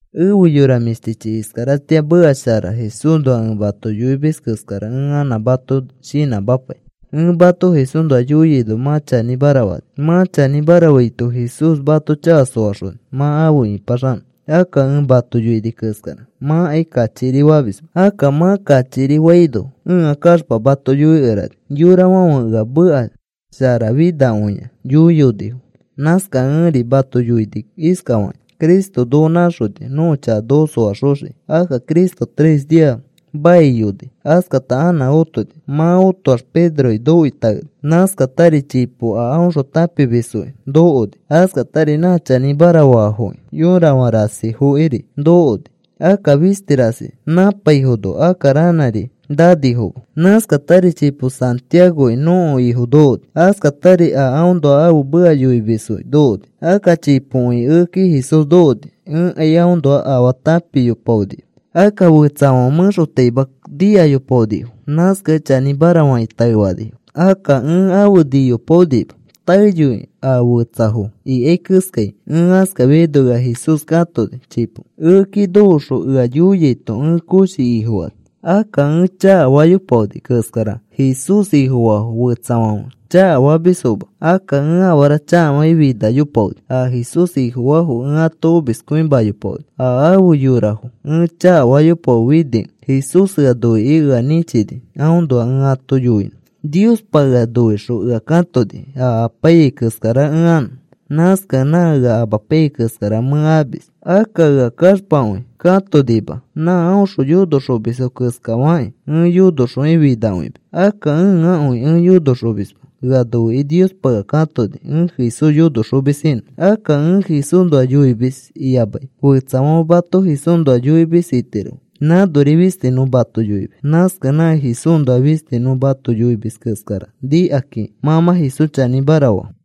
Efe yora mĩshtichi, iskaratĩa meka shara Jesúsnoa ẽ mato yoimis keskara ẽ anã mato shinãmapai. Ẽ mato Jesúsnoa yoiaino mã chanĩmara fani. Mã chanĩmara faito Jesús mato chaka soaxoni mã afe ĩpaxanõ. Akka ẽ mato yoini keskara mãkai kachikiri famisma. Akka mã kachikiri faino ẽa kaxpa mato yoikerani. Yorafãfe ea meka sharafinakõia yoiyonifo. Nãskakẽ ẽri mato yoini iskafakĩ: Cristo noko nãxoni nõko chaka noko soaxoxiki. Akka Cristo tres nia maiyoni. Askata anã otoni. Mã otoax Pedroki nokoi taeni. Nãskatari chipo a aõxõ tãpimisfokiri nokoni. Askatari nã chanĩmara faafoki yorafã rasifokiri nokoni. Akka fisti rasi nãpaifono, akka ranãri nanifoma. Nãskatari chipo Santiagoki nõko Ifo nokoni. Askatari a aõnoa ãfe meka yoimisfoki nokoni. Akka chipokõi ekeki Jesús nokoni. Ẽkai aõnoa afaa tãpiyopaonima. Akka fetsafãfe mẽxotaima nikayopaonifo. Nãskakẽ chanĩmara fakĩ taefanifo. Akka ẽ afe niyopaonima taeyoi a fetsafo ikai keskai. Ẽ askafiaino ea Jesús katoni chipo. Ekeki nokoxõ ea yoiaito ẽ koshi Ifofani. Akka ẽ chakafayopaoni keskara Jesús Ifofaa fetsafãfe chakafamisfoma. Akka ẽ afara chakafakĩ finayopaoni. A Jesús Ifofaafo ẽ ato omiskõimayopaoni. A afe yorafo ẽ chakafayopaonifikẽ Jesús ea noikĩ ea nĩchini aõnoa ẽ ato yoinõ. Niospa ea noixõ ea katoni a apaiyai keskara ẽ anõ. Nãskakẽ nã ea amapaiyai keskara mẽ amis. Akka ea kaxpakõi katonima. Nã aõxõ yonoxomisfo keskafakĩ ẽ yonoxokĩ finakõimis. Akka ẽakõi ẽ yonoxomisma. Ea noikĩ Niospa ea katoni ẽ Jesús yonoxomis inõ. Akka ẽ Jesúsnoa yoimis iyamai fetsafãfe mato Jesúsnoa yoimis itirofo nãnori fisti nõ mato yoimis. Nãskakẽ nã Jesúsnoa fisti nõ mato yoimis keskara nikakĩ mã mã Jesús chanĩmara faa.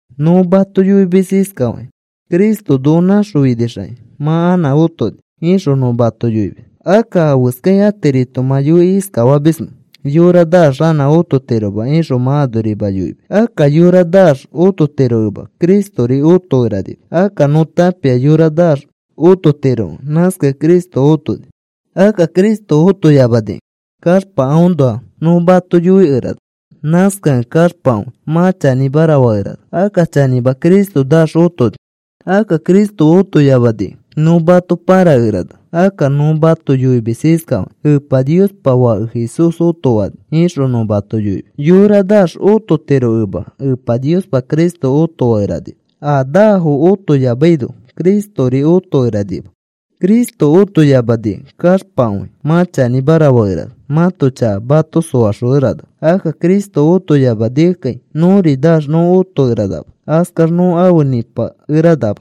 Nõ mato yoimis iskafakĩ: “Cristo noko naxõfinixakĩ mã anã otoni,” ixõ nõ mato yoimis. Akka, ¿afeskakĩ atirito mã yoikĩ iskafamismẽ? “Yora naax anã ototiroma,” ixõ mã anorima yoimis. Akka yora naax ototirokẽma Cristori otokeranima. Akka nõ tãpia yora naax ototirokẽ nãskakẽ Cristo otoni. Akka Cristo otoyamanikẽ kaxpa aõnoa nõ mato yoikerana. Nãskakẽ kaxpakõi mã chanĩmara fakerana. Akka chanĩma Cristo naax otoni. Akka Cristo otoyamanikẽ nõ mato pãrakerana. Akka nõ mato yoimis iskafakĩ: “Epa Niospa Fake Jesús otofani,” ixõ nõ mato yoimis. Yora naax ototirokẽma Epa Niospa Cristo otofakeranima. A naafo otoyamaino Cristori otokeranima. Cristo otoyamanikẽ kaxpakõi mã chanĩmara fakerana. Mãto chaka mato soaxokeranama. Akka Cristo otoyamanikẽkai nõri naax nõ otokeranama. Askax nõ afe nĩpakeranama.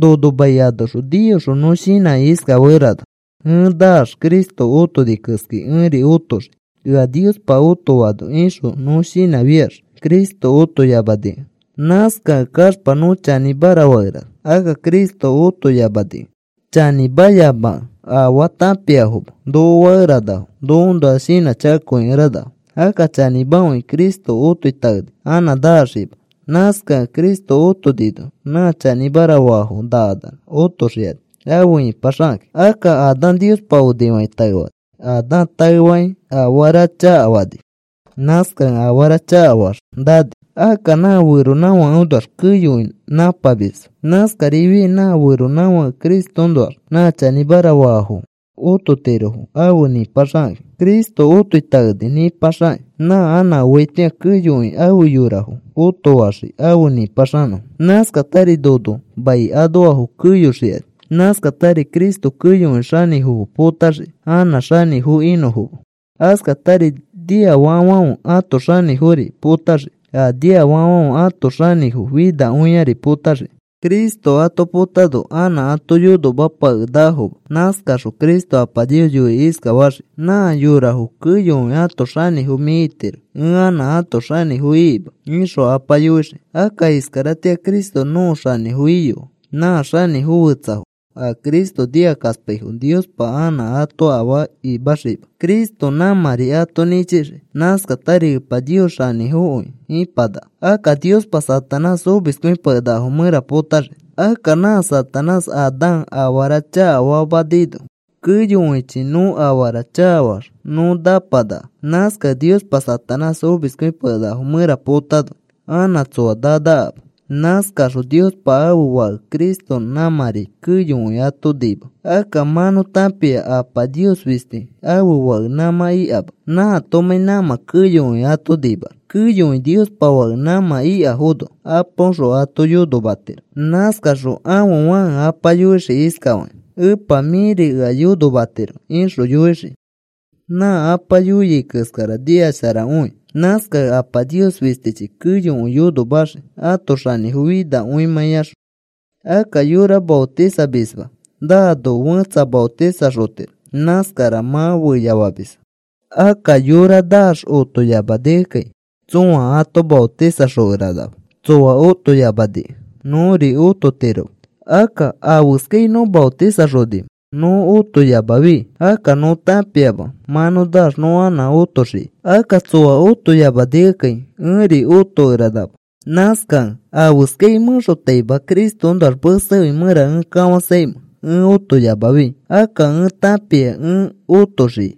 Nono mai anoxõ niyoxõ nõ shinãkĩ iskafakerana: “Ẽ naax Cristo otoni keskai ẽri otoxii ea Niospa otofaano,” ixõ nõ shinãfiax Cristo otoyamanikẽ nãskakẽ kaxpa nõ chanĩmara fakerana. Akka Cristo otoyamanikẽ chanĩmayamakẽ, “Afaa tãpiafoma,” noko fakeranafo nokoõnoa shinãchakakõikeranafo. Akka chanĩmakõi, Cristo otoi taeni. Anã naxiima. Nãskakẽ Cristo otonino nã chanĩmara faafo nakanax otoxikani afe ipaxakakĩ. Akka Adán Niospa onifakĩ taefani. Adán taefakĩ afara chakafani. Nãskakẽ afara chakafaax nani. Akka nã feronãfakeõnoax keyokõi nãpamisfo. Nãskarifiai nã feronãfake Cristoõnoax nã chanĩmara faafo ototirofo afe nĩpaxikakĩ. Cristo otoi taeni nĩpaxakĩ. Nã anã oaitĩa keyokõi afe yorafo otofaxii afe nĩpaxanõfo. Nãskatari nono mai anoafo keyoxikani. Nãskatari Cristo keyokõi xanĩfofo potaxii anã xanĩfo inõfoma. Askatari niafakafãfe ãto xanĩfofori potaxii. A niafakafãfe ãto xanĩfo finakõiari potaxii. Cristo ato potano anã ato yonomapakenakafoma. Nãskaxõ Cristo Apa Nios yoikĩ iskafaxii: “Mã yorafo keyokõi ãto xanĩfo mĩ itiro. Ẽ anã ãto xanĩfo ikima,” ixõ Apa yoixii. Akka iskaratĩa Cristo nõko xanĩfo iyoa. Nã xanĩfo fetsafo a Cristo nikakaspaifo Niospa anã ato afaa imaxiima. Cristo nãmãri ato nĩchixii. Nãskatari Epa Nios xanĩfokõi ipanaka. Akka Niospa Satanás omiskõipakenakafo mẽra potaxii. Akka nã Satanás Adán afara chakafamanino keyokõichi nõ afara chakafaax nõ napanaka. Nãskakẽ Niospa Satanás omiskõipakenakafo mẽra potano anã tsoa nanakama. Nãskaxõ Niospa ãfe Fake Cristo nãmãri keyokõi ato nima. Akka mã nõ tãpia Apa Nios fisti ãfe Fake nãmã ikama nãatomãi nãmã keyokõi ato nimax. Keyokõi Niospa Fake nãmã ikafono Apaõxõ ato yonomatiro. Nãskaxõ ãfe Fãke Apa yoixii iskafakĩ: “Epa mĩri ea yonomatiro,” ixõ yoixii. Nã Apa yoiai keskara nikasharakõi. Nãskakẽ Apa Nios fistichi keyokõi yonomaxii ãto xanĩfo finakõimãiaxõ. Akka yora maotisamisma naano fẽtsa maotisaxotiro. Nãskara mã feyafamisfo. Akka yora naax otoyamanikẽkai tsõa ato maotisanoxokeranama. Tsoa otoyamanikẽ nõri ototiroma. Akka, ¿afeskai nõ maotisaxonimẽ nõ otoyamafi? Akka nõ tãpia mã nõ naax nõ anã otoxiai. Akka tsoa otoyamanikẽkai ẽri otokeranama. Nãskakẽ, ¿afeskai mẽxotaima Cristoõnoax mesekõi mẽra ẽ kafãsaimẽ ẽ otoyamafi? Akka ẽ tãpia a ẽ otoxiai.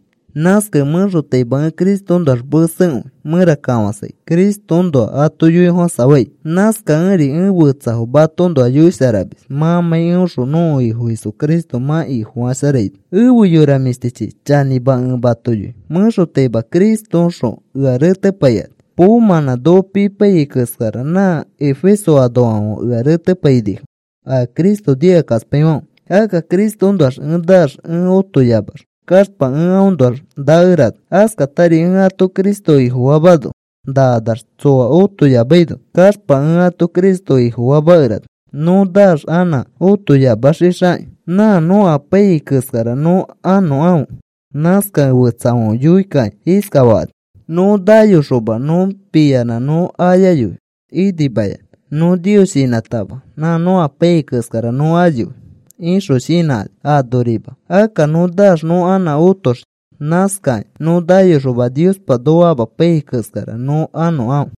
Nãskakẽ mẽxotaima ẽ Cristoõnoax mesekõi mẽra kafãsai Cristoõnoa ato yoifofãsafai. Nãskakẽri ẽ fetsafo matoõnoa yoisharamis mãmãi eõxõ nõko Ifo Jesucristo mã Ifosharafaino. Efe yora mĩshtichi, chanĩma ẽ mato yoi mẽxotaima Cristoõxõ ea retepaikani. Poomãnã noko pipaiyai keskara nã Efeso anoafãfe ea retepainifo, a Cristo nikakaspaifãfe. Akka Cristoõnoax ẽ naax ẽ otoyamax kaxpa ẽ aõnoax nakerana. Askatari ẽ ato Cristo Ifofamano nakanax tsoa otoyamaino kaxpa ẽ ato Cristo Ifofamakerana. Nõ naax anã otoyamafixixakĩ nã nõ apaiyai keskara nõ anõkãfe. Nãskakẽ fetsafãfe yoikakĩ iskafakani: “Nõ nayoxoma nõ piyanã nõ ayayoi inimayanã. Nõ Nios shinãtama nã nõ apaiyai keskara nõ ayoi,” ixõ shinãkani anorima. Akka nõ naax nõ anã otoxii. Nãskakĩ nõ nayoxoma Niospa noko amapaiyai keskara nõ anõkãfe.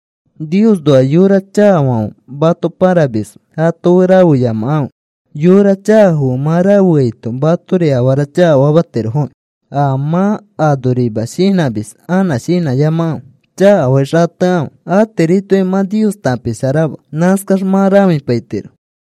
Niosnoa yora chakafãfe mato pãramisfo. ato fe rafeyamakãfe. Yora chakafo fe mã rafeaito matori afara chakafamatirofoki. A mã anorima shinãmis anã shinãyamakãfe. Chakafakĩ xatekãfe. Atiritokai mã Nios tãpisharama. Nãskax mã rãfipaitiro.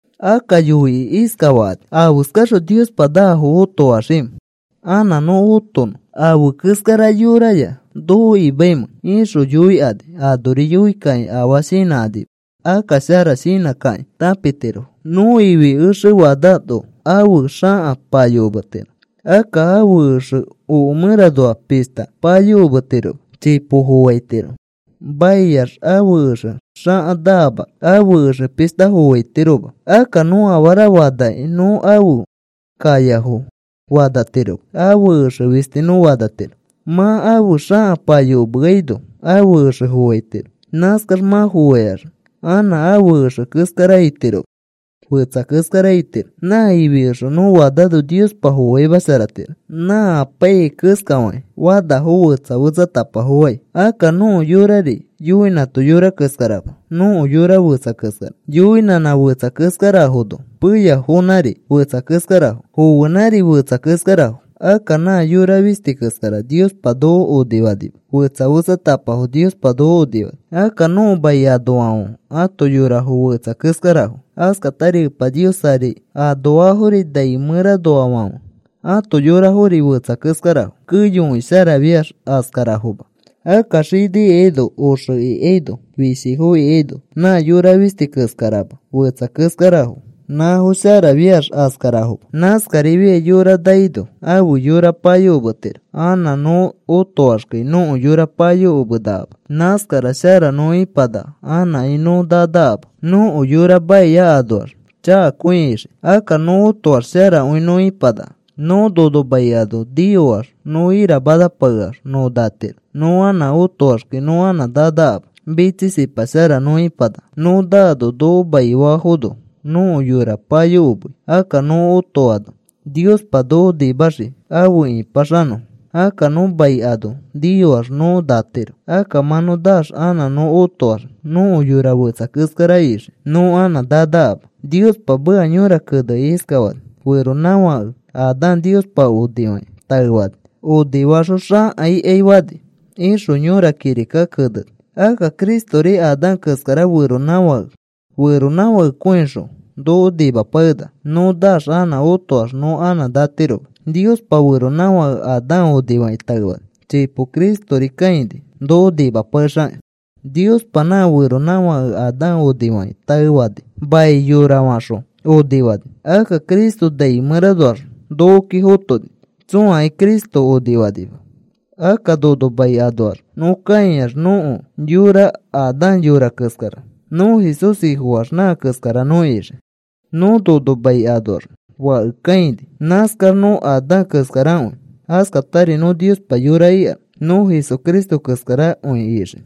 Akka yoikĩ iskafakani: “¿Afeskaxõ Niospa naafo otofaxiimẽ? ¿Anã nõ otonõ afe keskara yoraya noko imaimẽ?” ixõ yoikani. Anori yoikakĩ afaa shinãkanima. Akka shara shinãsharakakĩ tãpitirofo. Nõ ifi exe fanano ãfe xaka payokometiro. Akka ãfe exe oke mẽranoa pishta payokometiroma chipo foaitiro. Maiax ãfe exe xaka naamax ãfe exe pishta foaitiroma. Akka nõ afara fanakĩ nõ ãfe kayafoya fanatiroma. Ãfe exe fisti nõ fanatiro. Mã ãfe xaka payokomeaino ãfe exe foaitiro. Nãskax mã foaikax anã ãfe exe keskara itiroma. Fetsa keskara itiro. Nã ifi exe nõ fanano Niospa foaimasharatiro. Nã apaiyai keskafakĩ fanafo fetsa fetsatapafo fai. Akka nõko yorari yoinãto yora keskarama. Nõko yora fetsa keskara. Yoinãnã fetsa keskarafono peyafonãri fetsa keskarafo. Foenãri fetsa keskarafo. Akka nã yora fisti keskara Niospa noko onifanima, fetsa fetsatapafo Niospa noko onifani. Akka nõko mai anoafãfe ãto yorafo fetsa keskarafo. Askatari Epa Nios ari anoafori nai mẽranoafãfe ãto yorafori fetsa keskarafo. Keyokõi sharafiax askarafoma. Akka xini ikaino oxe ikaino fishifo ikaino nã yora fisti keskarama fetsa keskarafo. Nãfo sharafiax askarafoma. Nãskarifiai yora naino ãfe yora payokometiro. Anã nõ otoaxkai nõko yora payokomenakama. Nãskara shara nõ ipanaka anãkai nõ nanakama. Nõko yora maia anoax chakakõi ixii. Akka nõ otoax sharakõi nõ ipanaka. Nõ nono mai ano niyoax nõ iramanapakeax nõ natiro. Nõ anã otoaxkai nõ anã nanakama, mitsisipa shara nõ ipanaka. Nõ naano noko maifafono nõko yora payokomei. Akka nõ otoano Niospa noko nimaxii afe ĩpaxanõfo. Akka nõ mai ano niyoax nõ natiro. Akka mã nõ naax anã nõ otoax nõko yora fetsa keskara ixii. Nõ anã nanakama. Niospa meka yõra kenekĩ iskafani: “Feronãfake Adán Niospa onifakĩ taefani. Onifaxõ xãka ikai fani,” ixõ yõra kirikaki keneni. Akka Cristori Adán keskara feronãfake. Feronãfakekõixõ noko nimapakenaka. Nõ naax anã otoax nõ anã natiroma. Niospa feronãfake Adán onifakĩ taefani. Chipo Cristori kãini noko nimapakexakĩ. Niospa nã feronãfake Adán onifakĩ taefani. Mai yorafaxõ onifani. Akka Cristo nai mẽranoax nokoki fotoni. Tsõakai Cristo onifanima. Akka nono mai anoax nõ kãiax nõko yora Adán yora keskara. Nõ Jesús Ifofaax nã keskara nõ ixii. Nõ nono mai anoax fake kãini. Nãskax nõ Adán keskarakõi. Askatari nõ Niospa yora ikax nõ Jesucristo keskarakõi ixii.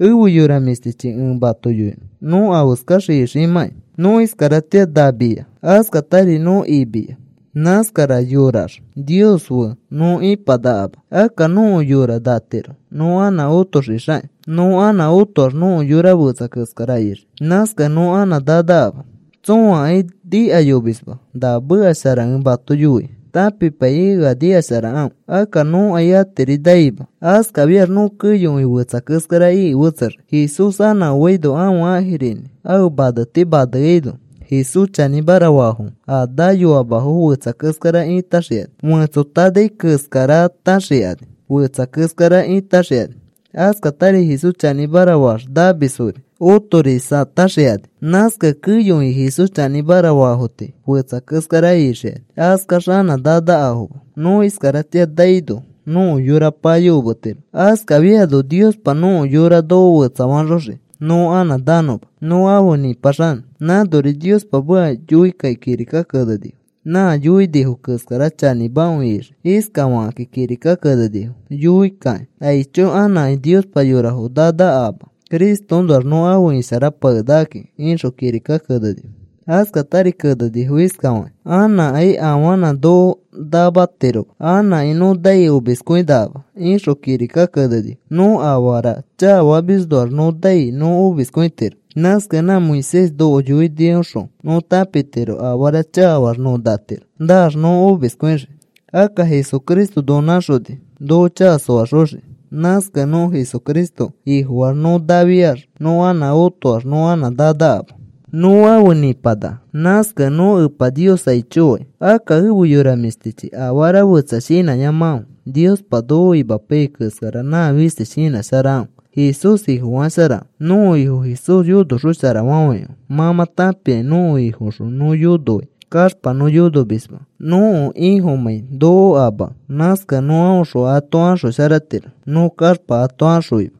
Efe yora mĩshtichi, ẽ mato yoinõ nõ afeskax iximãkai. Nõ iskaratĩa namiya. Askatari nõ imiya. Nãskara yorayax Nios fe nõ ipanakama. Akka nõko yora natiro nõ anã otoxixakĩ. Nõ anã otoax nõko yora fetsa keskara ixii. Nãskakẽ nõ anã nanakama. Tsõakai nikayomisma na meka shara ẽ mato yoi. Tãpipaikĩ ea nikasharakãfe. Akka nõkai atiri naima. Askafiax nõ keyokõi fetsa keskara iki fetsexii. Jesús anã oaino ãfe ãjirinĩ ãfe maneti maneaino Jesús chanĩmara faafo, a nayoamafo, fetsa keskara ĩtaxikani. Fetsoitanai keskarataxikani fetsa keskara ĩtãxikani. Askatari Jesús chanĩmara faax namisfori otorisataxikani. Nãskakẽ keyokõi Jesús chanĩmara faafo tii fetsa keskara ixikani. Askax anã nanakafoma. Nõ iskaratĩa naino nõko yora payokometiro. Askafiano Niospa nõko yora noko fetsafaxoxii nõ anã nanõma, nõ afe nĩpaxanõ. Nãnori Niospa meka yoikakĩ kirika kenenifo. Nã yoinifo keskara chanĩmakõi ixii. Iskafakakĩ kirika kenenifo yoikakĩ: “Aicho. Anãkai Niospa yorafo nanakama. Cristoõnoax nõ afe isharapakenakaki,” ixõ kirika kenenifo. Askatari kenenifo iskafakĩ: “Anãkai afanã noko namatiroma. Anãkai nõ nai omiskõinakama,” ixõ kirika kenenifo. Nõ afara chakafamisnoax nõ nai nõ omiskõitiro. Nãskakẽ nã Moisés noko yoinioxõ nõ tãpitiro afara chakafaax nõ natiro. Naax nõ omiskõixii. Akka Jesucristo noko nãxoni noko chaka soaxoxiki. Nãskakẽ nõ Jesucristo Ifofaax nõ nafiax nõ anã otoax nõ anã nanakama. Nõ afe nĩpanaka. Nãskakẽ nõ Epa Nios aicho fai. Akka efe yora mĩshtichi, afara fetsa shinãyamakãfe. Niospa noko imapaiyai keskara nã fisti shinãsharakãfe. Jesús Ifofasharakãfe. Nõko Ifo Jesús yonoxosharafafãikãfe. Mã mã tãpia nõko Ifoõxõ nõ yonoai kaxpa nõ yonomisma, nõko Ifomãi noko amakẽ. Nãskakẽ nõ aõxõ ato axosharatiro nõ kaxpa ato axõima.